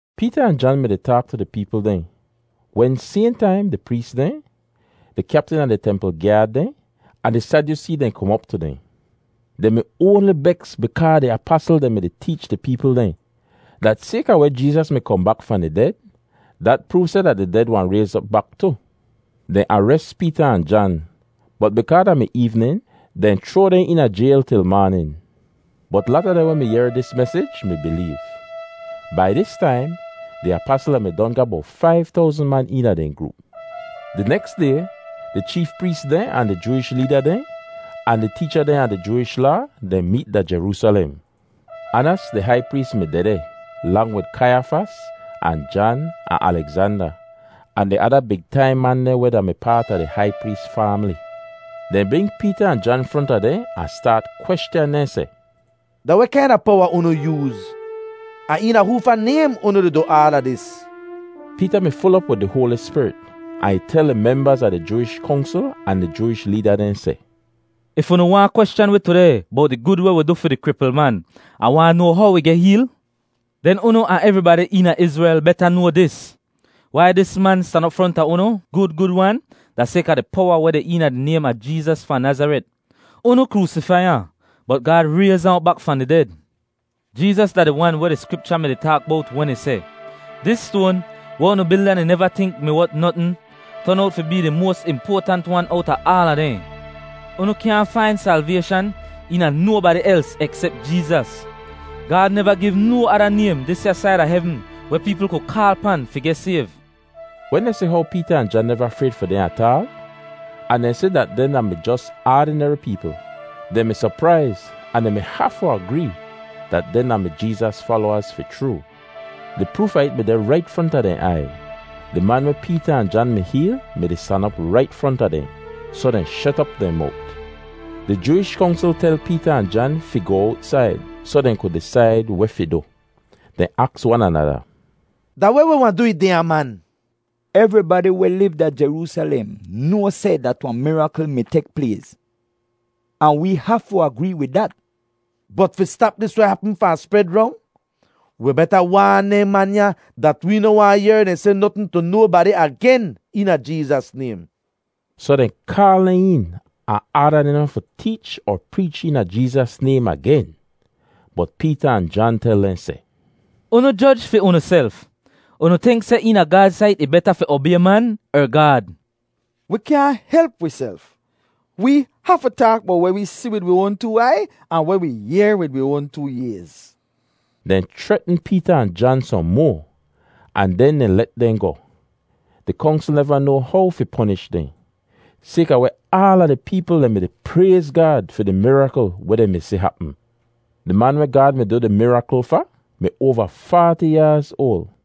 Peeta ahn Jan mi-di taak tu di peepl dehn wen sayhn taim di prees dehn, di kyaptin a di templ gyaad dehn, ahn di Sadyusee dehn kom op tu dehn. Dehn mi oanli beks bikaa di apasl dehn mi-di teech di peepl dehn, dat sayka weh Jeezas mi kohn bak fahn di ded, dat proov seh dat di ded wahn rayz op bak tu. Dehn ares Peeta ahn Jan, bot bikaa da mi eevnin, dehn chroa dehn eena jayl til maanin. Bot lata dehn weh mi yehr dis mesij mi bileev. Bai dis taim, di apasl dehn mi don ga bowt faiv towzn man eena dehn groop. Di neks day, di cheef prees dehn ahn di Jooish leeda dehn, ahn di teecha dehn a di Jooish Laa dehn meet da Jeroosalem. Anas di hai prees mi dehdeh, lang wid Kaiyafas ahn Jan ahn Alegzanda, ahn di ada big taim man dehn weh da-mi paat a di hai prees faamli. Dehn bring Peeta ahn Jan fronta dehn ahn staat kweschan dehn seh, “Da weh kaina powa unu yooz, ahn eena hoofa naym unu di du aala dis?” Peeta mi ful op wid di Hoali Spirit ahn ih tel di membaz a di Jooish Kongsl ahn di Jooish leeda dehn seh, “If unu waahn kweschan wi tudeh bowt di gud weh wi du fi di kripl man, ahn waahn noa how ih geh heel, den unu ahn evribadi eena Izrel beta noa dis: Wai dis man stan op fronta unu gud gud-wan da sayka di powa weh deh eena di naym a Jeezas fahn Nazaret. Unu kroosifai ahn, bot Gaad rayz ahn op bak fahn di ded. Jeezas da di Wan weh di Skripcha mi-di taak bowt wen ih seh, ‘Dis stoan weh unu bilda dehn neva tink mi wot notn, ton owt fi bee di moas impoatant wan owta aala dehn.’ Unu kyaahn fain salvayshan eena nobadi els eksep Jeezas! Gaad neva giv no ada naym disya said a hevn weh peepl ku kaal pan fi geh sayv!” Wen dehn si how Peeta ahn Jan neva frayd fi dehn ataal, ahn dehn si dat dehn da-mi jos aadineri peepl, dehn mi sopraiz ahn dehn mi hafu agree dat dehn da-mi Jeezas falowaz fi chroo. Di proof a it mi deh rait fronta dehn aiy. Di man weh Peeta ahn Jan mi heel mi-di stan op rait fronta dehn, soh dehn shet op dehn mowt. Di Jooish Kongsl tel Peeta ahn Jan fi goh owtsaid soh dehn ku disaid weh fi du. Dehn aks wan anada, “Da weh wi wahn du wid dehnya man? Evribadi weh liv da Jeroosalem noa seh dat wahn mirakl mi tek plays, ahn wee hafu agree wid dat. Bot fi stap dis weh hapm fahn spred rong, wi beta waan dehn man ya dat wee noh waahn yehr dehn seh notn tu nobadi agen eena Jeezas naym.” Soh dehn kaal dehn een ahn aada dehn noh fi teech er preech eena Jeezas naym agen. Bot Peeta ahn Jan tel dehn seh, “Unu joj fi unuself; unu tink seh eena Gaad sait ih beta fi obay man er Gaad? Wi kyaahn help wiself. Wee hafu taak bowt weh wi si wid wi oan too aiy, ahn weh wi yehr wid wi oan too ayz.” Dehn chretn Peeta ahn Jan sohn moa, ahn den dehn let dehn goh. Di Kongsl neva noa how fi ponish dehn, sayka weh aala di peepl dehn mi-di prayz Gaad fi di mirakl weh dehn mi si hapm. Di man weh Gaad mi du di mirakl fa mi oava faati yaaz oal.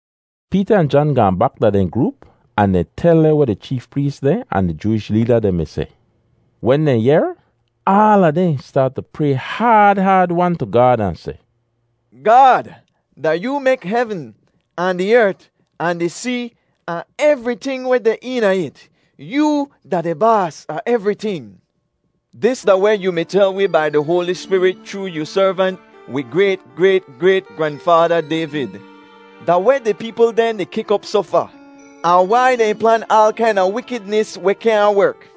Peeta ahn Jan gaahn bak da dehn groop ahn dehn tel dehn weh di cheef prees dehn ahn di Jooish leeda dehn mi seh. Wen dehn yehr, aala dehn staat tu pray haad haad-wan tu Gaad ahn seh, “Gaad, da yoo mek hevn, ahn di ert, ahn di see, ahn evriting weh deh eena it. Yoo da di baas a evriting. Dis da weh yu mi tel wi bai di Hoali Spirit chroo yu servant, wi grayt-grayt-grayt-granfaada Dayvid: ‘Da weh di peepl dehn di kik op soh fa? Ahn wai dehn plan aal kaina wikidnis weh kyaahn werk?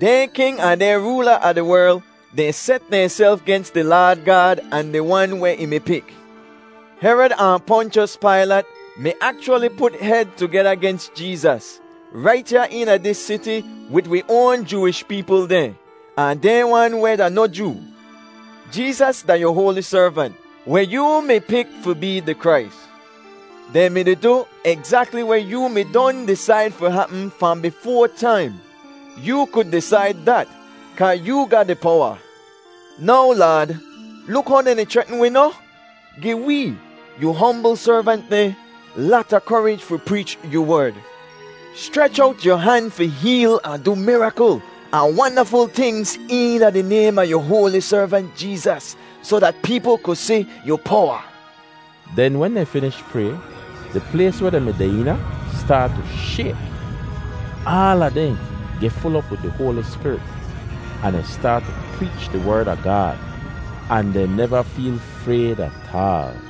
Dehn king ahn dehn roola a di werl dehn set dehnself gens di Laad Gaad ahn di Wan weh ih mi pik.’ Herod ahn Ponchos Pailat mi akchwali put hed tugeda gens Jeezas rait ya eena dis siti wid wi oan Jooish peepl dehn, ahn dehn wan weh da noh Joo. Jeezas da yu Hoali Servant, weh yoo mi pik fi bee di Krais. Dehn mi-di du egzakli weh yoo mi don disaid fi hapm fahn bifoa taim. Yoo ku disaid dat kaa yoo ga di powa. Now Laad, luk how dehn di chretn wi noh! Gi wee, yu hombl servant dehn, lata korij fi preech yu Werd. Schrech owt yu han fi heel ahn du mirakl ahn wandaful tingz eena di naym a yu Hoali Servant Jeezas, soh dat peepl ku si yu powa.” Den wen dehn finish pray, di plays weh dehn mi deh eena staat tu shayk. Aala dehn geh ful op wid di Hoali Spirit, ahn dehn staat tu preech di Werd a Gaad, ahn dehn neva feel frayd ataal.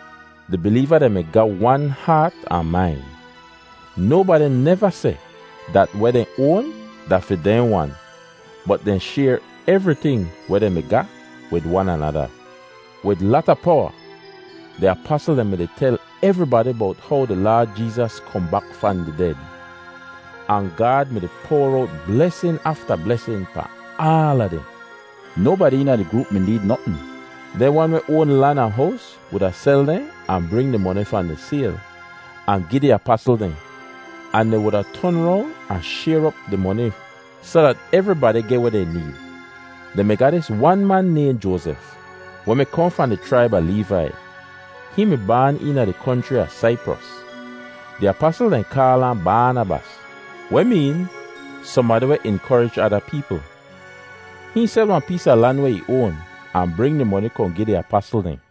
Di bileeva dehn mi ga wan haat ahn main. Nobadi neva seh dat weh dehn oan da fi dehn wan, bot dehn shayr evriting weh dehn mi ga wid wan anada. Wid lata powa, di apasl dehn mi-di tel evribadi bowt how di Laad Jeezas kohn bak fahn di ded. Ahn Gaad mi-di poar owt blesin afta blesin pahn aala dehn. Nobadi eena di groop mi need notn. Dehn wan weh oan lan ahn hows wuda sel dehn ahn bring di moni fahn di sayl, ahn gi di apasl dehn. Ahn dehn wuda ton rong ahn shayr op di moni soh dat evribadi geh weh dehn need. Dehn mi ga dis wan man nayhn Joazef weh mi kohn fahn di chraib a Leevai. Hihn mi baan eena di konchri a Saipros. Di apasl dehn kaal ahn Baanabas (weh meen “sohnbadi weh inkorij ada peepl.”) Hihn sel wahn pees a lan weh ih oan, ahn bring di moni kohn gi di apasl dehn.